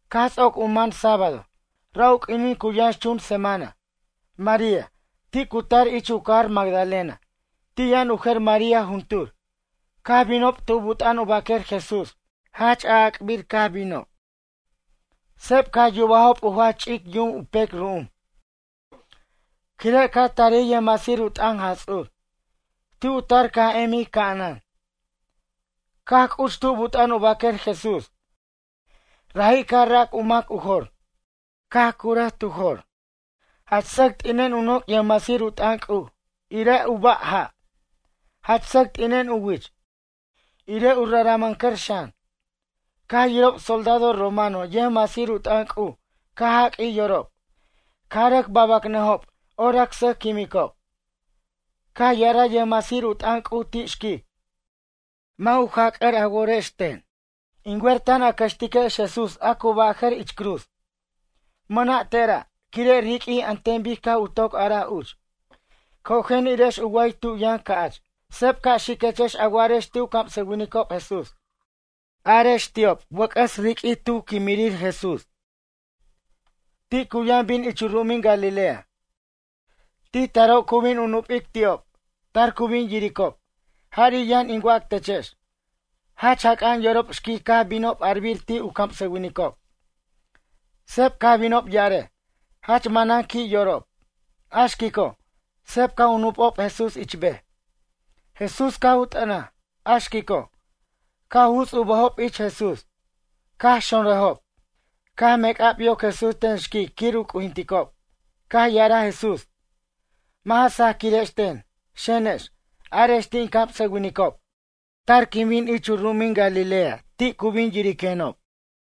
Caj ts'oc u man sábado, ra' u q'uinin cu yʌnxchun semana, María, ti' cu tar ich u cajar Magdalena. Ti' yʌn u jer María juntur. Caj binob tu but'a'an u baquer Jesús. Jach a'ac'bir caj binob. Seb caj yubajob u jach ch'ic yum u pec ru'um, quire' caj tarij yʌjmasir u t'ʌn Jaj Ts'ur. Ti' u tar caj emij ca'anan. Caj c'uch tu but'a'an u baquer Jesús. Raji' caj rac u mac u jor, caj curaj tu jor. Jach sʌc t'inen u noc' yʌjmasir u t'ʌn C'uj, irej u ba' ja', jach sʌc t'inen u wich, irej u raramʌncʌr xan. Caj yirob soldado romano yʌjmasir u t'ʌn C'uj caj jaq'uij yorob. Caj rʌc babʌcnʌjob orac sʌj quimicob. Caj ya'araj yʌjmasir u t'ʌn C'uj ti' xquic: ―Mʌ' u jac'ʌr a worex ten. In wer tan a cʌxtiquex Jesús a cu bʌjʌ'r ich cruz. Mʌna' tera', quire' riq'uij an ten bic caj u toc araj uch. Cojen irex u wa'ay tu yʌn ca'ch. Seb ca' xiquechex a wa'arex ti' u camsʌwinicob Jesús. Arex ti'ob wʌc'ʌs riq'uij tu quimirir Jesús. Ti cu yʌn bin ich u ru'umin Galilea. Ti' taro' cu bin u nupic ti'ob. Tar cu bin yiricob. Jari' yʌn in wac techex. Jach jac'a'an yorob xquic caj binob arbir ti' u camsʌwinicob. Seb caj binob ya'arej. Jach manan qui' yorob. A xquico', seb caj u nupob Jesús ich bej. Jesús caj u t'ʌnaj. A xquico', caj u juts u bʌjob ich Jesús, caj xonrʌjob. Caj mec'ab yoc Jesús ten xquic quir u c'ujinticob. Caj ya'araj Jesús: ―Mʌ' ja sajquirex ten. Xenex, arex ti' in camsʌwinicob: “Tar quin bin ich u ru'umin Galilea ti' cu bin yiriquenob.”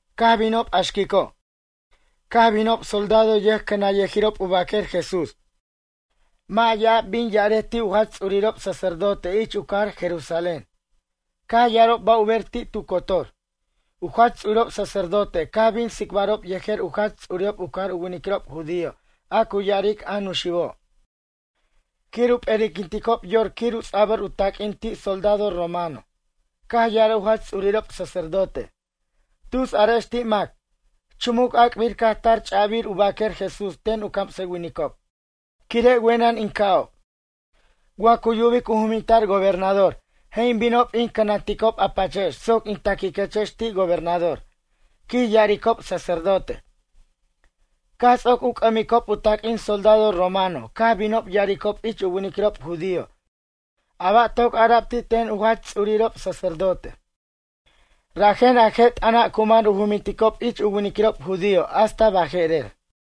Caj binob a xquico', caj binob soldado yʌjcʌnanyʌjirob u baquer Jesús. Mʌ' ya'ab bin ya'arej ti' u jach ts'urirob sacerdote ich u cajar Jerusalén. Caj ya'arob ba' u ber ti' tu cotor. U jach ts'urirob sacerdote caj bin tsicbarob yejer u jach ts'urirob u cajar u winiquirob judío a cu ya'aric a Nuxibo'. Quir u p'eri'quinticob yor quir u ts'abʌr u taq'uin ti' soldado romano. Caj ya'araj u jach ts'urirob sacerdote: ―Tus arex ti' mac: “Chumuc ac'bir caj tar ch'abir u baquer Jesús ten u camsʌwinicob. Quire' wenʌn in ca'ob.” Wa cu yubic u juminta'r gobernador je' in binob in cʌnanticob a pachex soc in ta'quiquechex ti' gobernador ―quij ya'aricob sacerdote. Caj ts'oc u c'ʌmiquicob u taq'uin soldado romano caj binob ya'aricob ich u winiquirob judío a ba' toc ara'b ti' ten u jach ts'urirob sacerdote. Rajen a je' t'ʌna' cu man u juminticob ich u winiquirob judío hasta baje'rer.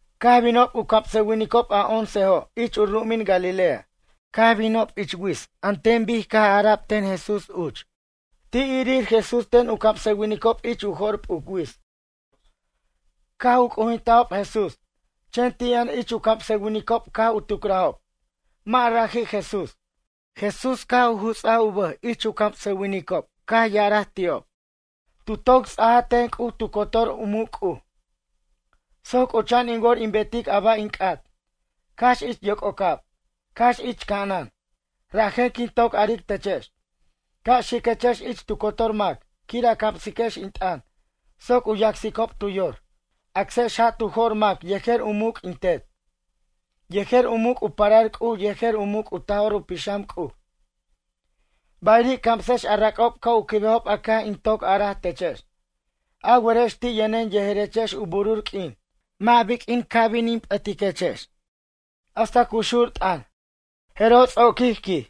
Caj binob u camsʌwinicob a oncejo' ich u ru'umin Galilea. Caj binob ich wits bic caj ara'b ten Jesús uch. Ti' irir Jesús ten u camsʌwinicob ich u jo'r p'uc wits. Caj u c'ujintajob Jesús. Chen ti' yʌn ich u camsʌwinicob caj u tucrajob: ―Mʌ' raji' Jesús. Jesús caj u juts'aj u bʌj ich u camsʌwinicob caj ya'araj ti'ob: ―Tu toc ts'aja ten C'uj tu cotor u muc' C'uj, soc c'ucha'an in wor in betic a ba' in c'at, cax ich yoc'ocab, cax ich ca'anan. Rajen quin toc aric techex: Ca' xiquechex ich tu cotor mac quir a camsiquex in t'ʌn soc u yacsicob tu yor. Acsex ja' tu jo'r mac yejer u muc' in Tet, yejer u muc' u parar C'uj yejer u muc' u Taj'or u Pixam C'uj. Bayiri' camsex a rac'ob ca' u quibejob a caj in toc araj techex. A werex ti' yʌnen yejerechex u burur q'uin. Mʌ' biq'uin bin in ca' p'ʌtiquechex. Hasta cu xur t'ʌn. Jeroj ts'oquij quij.